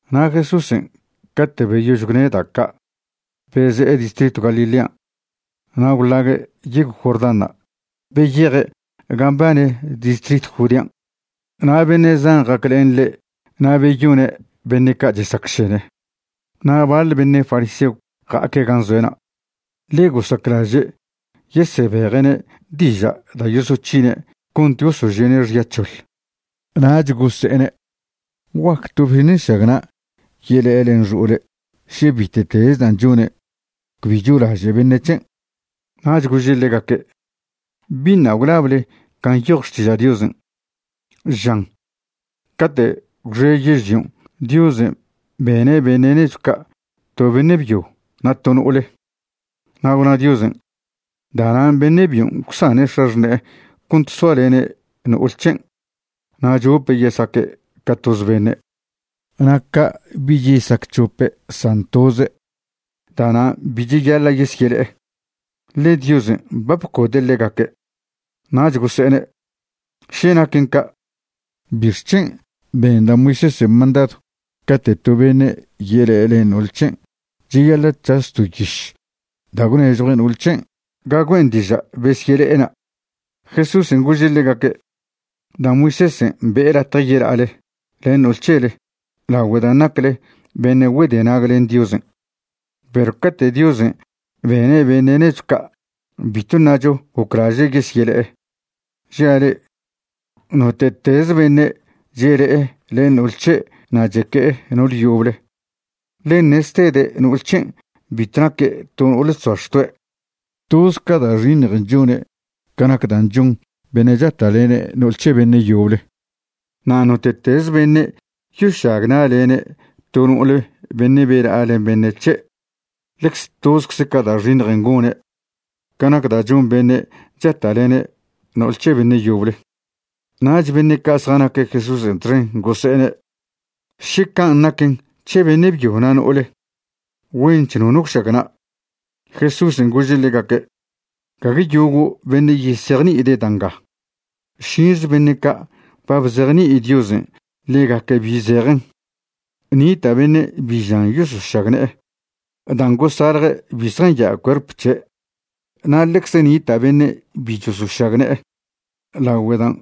Na' Jesúsen' cate' beyož gwne' da' ca' beze'e distritw Galilean' na' gwḻague' yegw Jordánṉa' beyeje' gan' mbane distritw Judean'. Na' beṉe' zan ja'aclen ḻe', na' beyone' beṉe' ca' chesacšene. Na' baḻ beṉe' fariseo ja'aque' gan' zoe'na', ḻe gosaclaže' yesebeje'ne' diža' da' yosoc̱hine' cont gosožie'ne' xya c̱hoḻ, nach gose'ene': ―¿Guac to beṉe' nšagna' yele'e len xo'ole' še bite'teze dan' chone' cbi cholaže' beṉe' c̱hen'? Nach gože' ḻegaque': ―¿Biṉa' gwlable can' nyoj Xtiža' Diosen'? Žan cate' gwxe yežlion' Diosen' bene' beṉe' nechw ca' to beṉe' byo na' to no'ole. Na' gwna Diosen': “Da'nan' beṉe' byon' gwsane' x̱axṉe'e cont soalene' no'ole c̱hen' na' chope' yesaque' ca toz beṉe'.” Na' ca' bich yesac c̱hope' san toze'. Da'nan' bi cheyaḻa' yesyele'e, ḻe Diosen' ba bcode' ḻegaque'. Nach gose'ene': ―Še naquen ca' ¿bixc̱hen' ben da' Moisésen' mandadw cate' to beṉe' yele'e len no'ol c̱hen' cheyaḻa' c̱has to yiš da' gwnežjue' no'ol c̱hen' ga güen' diža' besyele'ena'? Jesúsen' gože' ḻegaque': ―Da' Moisésen' be'e latje yela'ale len no'ol c̱hele lagüe dan' nacle beṉe' güedenag len Diosen'. Perw cate' Diosen' bene' beṉe' nechw ca' bitw ṉacho goclaže' yesyele'e. Žia' le'e, note'teze beṉe' chele'e len no'ol c̱he' na' cheque'e no'ole yoble, ḻen ṉeztede' no'ol c̱hen' bitw naque' to no'ole chzoa xtoe', toz ca da' xiṉjen' chone' ca nac dan' chon ben' chata'lene' no'ol c̱he beṉe' yoble. Na' note'teze beṉe' yošagna'lene' to no'ole beṉe' bela'a len beṉe' c̱he', ḻecze tozcze ca da' xiṉj gone' ca nac da' chon beṉe' chata'lene' no'ol c̱he beṉe' yoble. Nach beṉe' ca' zjanaque' Jesúsen' txen gose'ene': ―Še can' naquen c̱he beṉe' byo na' no'ole, güench nono gwšagna'. Jesúsen' gože' ḻegaque': ―Gague yogo' beṉe' yesejni'ide' da' nga, šinze beṉe' ca' ba bzejni'i Diosen' ḻegaque' bi zejen. Nita' beṉe' bi žan yosošagne'e dan' gosalje' bi zjanya' cuerp c̱he', na' ḻecze nita' beṉe' bi chosošagne'e lagüe dan'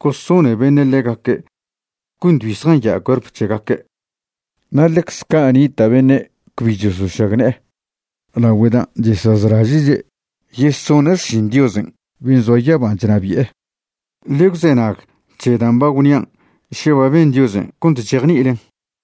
gosone beṉe' ḻegaque' cont bi zjanya' cuerp c̱hegaque'. Na' ḻecze ca' nita' beṉe' cbi chosošagne'e lagüe dan' chesazlaže'che' yesone' xšin Diosen' ben' zoa yaban' chnabi'e. Ḻe gwzenag c̱he dan' ba gwnian' še ba ben Diosen' cont chejni'ilen.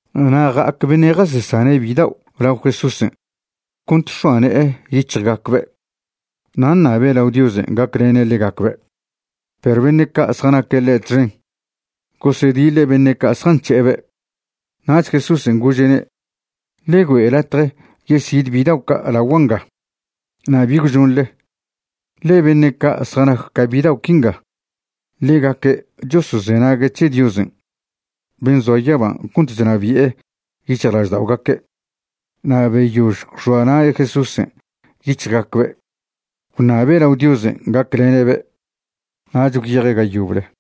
Na' ja'ac beṉe' jasesane' bidao' lao Jesúsen' cont x̱oa ne'e yic̱hjgacbe' na' ṉabe' lao Diosen' gaclene' ḻegacbe'. Perw beṉe' ca' zjanaque' ḻe' txen gosediḻe' beṉe' ca' zjanc̱he'ebe'. Nach Jesúsen' gože'ne': ―Ḻe güe' latje yesid bidao' ca' lagua' nga, na' bi gwžonḻe, ḻe beṉe' ca' zjanac ca bidao' quinga, ḻegaque' chosozenague' c̱he Diosen' ben' zoa yaba cont chnabi'e yic̱hjlažda'ogaque'. Na' beyož gwx̱oa na' Jesúsen' yic̱hjgacbe' gwṉabe' lao Diosen' gaclene'be', nach gwyeje' ga yoble.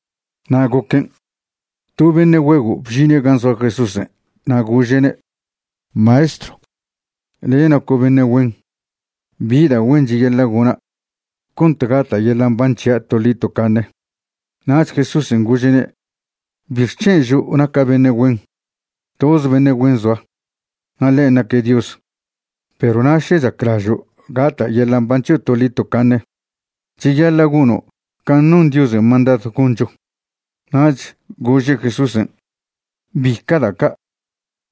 Na' goquen', to beṉe' güego' bžine' gan' zoa Jesúsen', na' gože'ne': ―Maestrw, le' naco' beṉe' güen. ¿Bi da' güen cheyaḻa' gona' cont gata' yeḻa' mban c̱hia' toḻi tocaṉe? Nach Jesúsen' gože'ne': ―¿Bixc̱hen' žo' naca' beṉe' güen? Toz beṉe' güen zoa, na' ḻen' naque' Dios. Perw na' še chaclažo' gata' yeḻa' mban c̱hio' toḻi tocaṉe, cheyaḻa' gono' can' non Diosen' mandadw goncho. Nach gože' Jesúsen': ―¿Bica' da' ca'?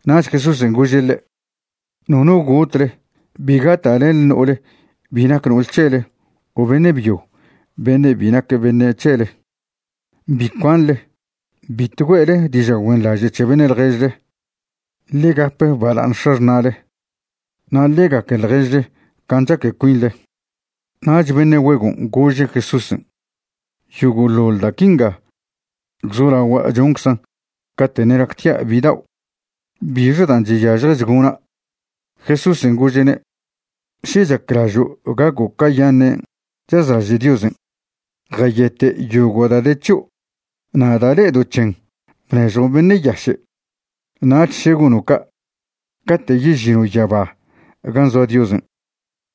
Nach Jesúsen' gože' ḻe': ―Nono gotle, bi gata'lenḻe no'ol bi nac no'ol c̱hele o beṉe' byo beṉe' bi nac beṉe' c̱hele, bi cuanḻe, bitw güe'le diža' güenḻaže' c̱he beṉe' ḻježle. Ḻe gap bala'aṉ x̱axṉa'le, na' ḻe gaque ḻježle can' chaque cuinḻe. Nach beṉe' güegon' gože' Jesúsen': ―Yogo'ḻoḻ da' quinga gwzolagua' chonczan' cate' ṉe' nactia' bidao'. ¿Bixe dan' chyažjech gona'? Jesúsen' gože'ne': ―Še chaclažo' gaco' cayaṉen' chazlaže' Diosen', jayete' yogo' da' de c̱hio', na' da' le'edo' c̱hen bnežjon beṉe' yaše'. Nach še gono' ca', cate' yežino' yaba gan' zoa Diosen',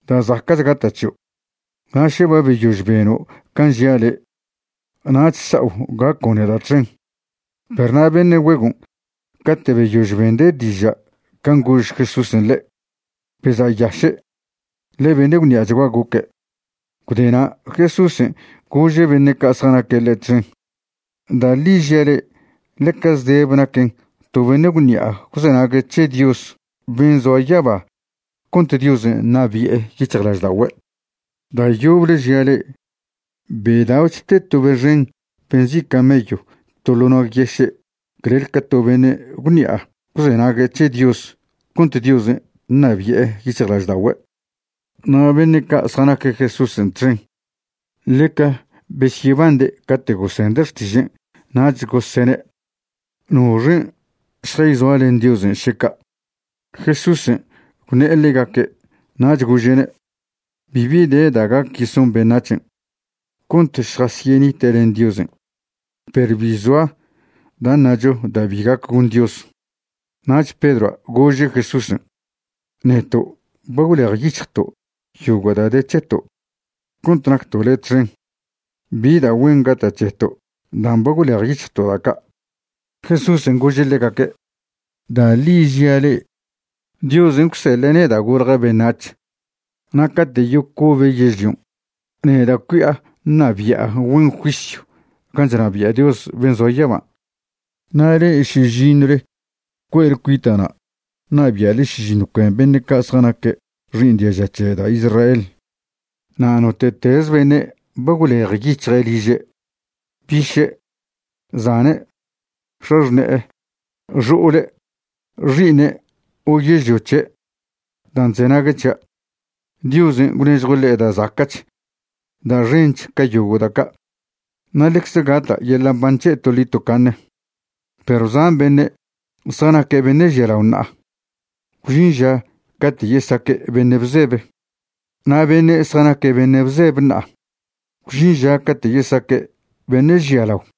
da' zaca'ch gata' c̱hio'. Na' še ba beyož beno' can' žia' le', nach sao' gaco' neda' txen. Perw na' beṉe' güegon' cate' beyož bende' diža' can' gož Jesúsen' ḻe', beza'yaše', ḻe beṉe' gwṉi'achgua goque'. Gwde na' Jesúsen' gože' beṉe' ca' zjanaque' ḻe' txen: ―Da' ḻi žia' le'e, ḻeca zdebe naquen to beṉe' gwṉi'a gwzenague' c̱he Dios ben' zoa yaba cont Diosen' ṉabi'e yic̱hjlažda'ogüe'. Da' yoble žia' le'e, bedao'ch te to be xen be nzi' camello to ḻo' nag yeše' clel ca to beṉe' gwṉi'a gwzenague' c̱he Dios cont Diosen' ṉabi'e yic̱hjlažda'ogüe'. Na' beṉe' ca' zjanaque' Jesúsen' txen ḻeca besyebande' cate' gosende' xtižen', nach gosene': ―¿Noxen' šjayzoa len Diosen' še ca'? Jesúsen' gwṉe'e ḻegaque', nach gože'ne': ―Bibi de da' gac yeson beṉac̱hen' cont šjasyenite' len Diosen', perw bi zoa da' ṉacho da' bi gac gon Dios. Nach Pedroa' gože' Jesúsen': ―Neto' ba gwlejyic̱hjto' yogo' da' de c̱heto' cont nacto' le' txen. ¿Bi da' güen gata' c̱heto' dan' ba gwlejyic̱hjto' da' ca'? Jesúsen' gože' ḻegaque': ―Da' ḻi žia' le'e, Diosen' gwseḻe' neda' golja' beṉac̱h na' cate' yocobe' yežlion', neda' cui'a ṉabi'a güen juisyw can' chnabia' Dios ben' zoa yaba. Na' le'e šižiṉwle cue'le cuita'na' ṉabia'le šižiṉw cuen beṉe' ca' zjanaque' xi'iṉ diaža c̱he da' Israel. Na' note'teze beṉe' ba gwlejyic̱hje' liže', biše', zane', x̱axṉe'e, xo'ole', xi'iṉe' o yežlio c̱he', dan' chzenague' c̱hia', Diosen' gwnežjue' ḻe' da' zaca'ch da' xench ca yogo' da' ca'. Na' ḻecze gata' yeḻa' mban c̱he' toḻi tocaṉe. Perw zan beṉe' zjanaque' beṉe' žialao ṉa'a, gwžin ža cate' yesaque' beṉe' bzebe. Na' beṉe' zjanaque' beṉe' bzebe ṉa'a, gwžin ža cate' yesaque' beṉe' žialao.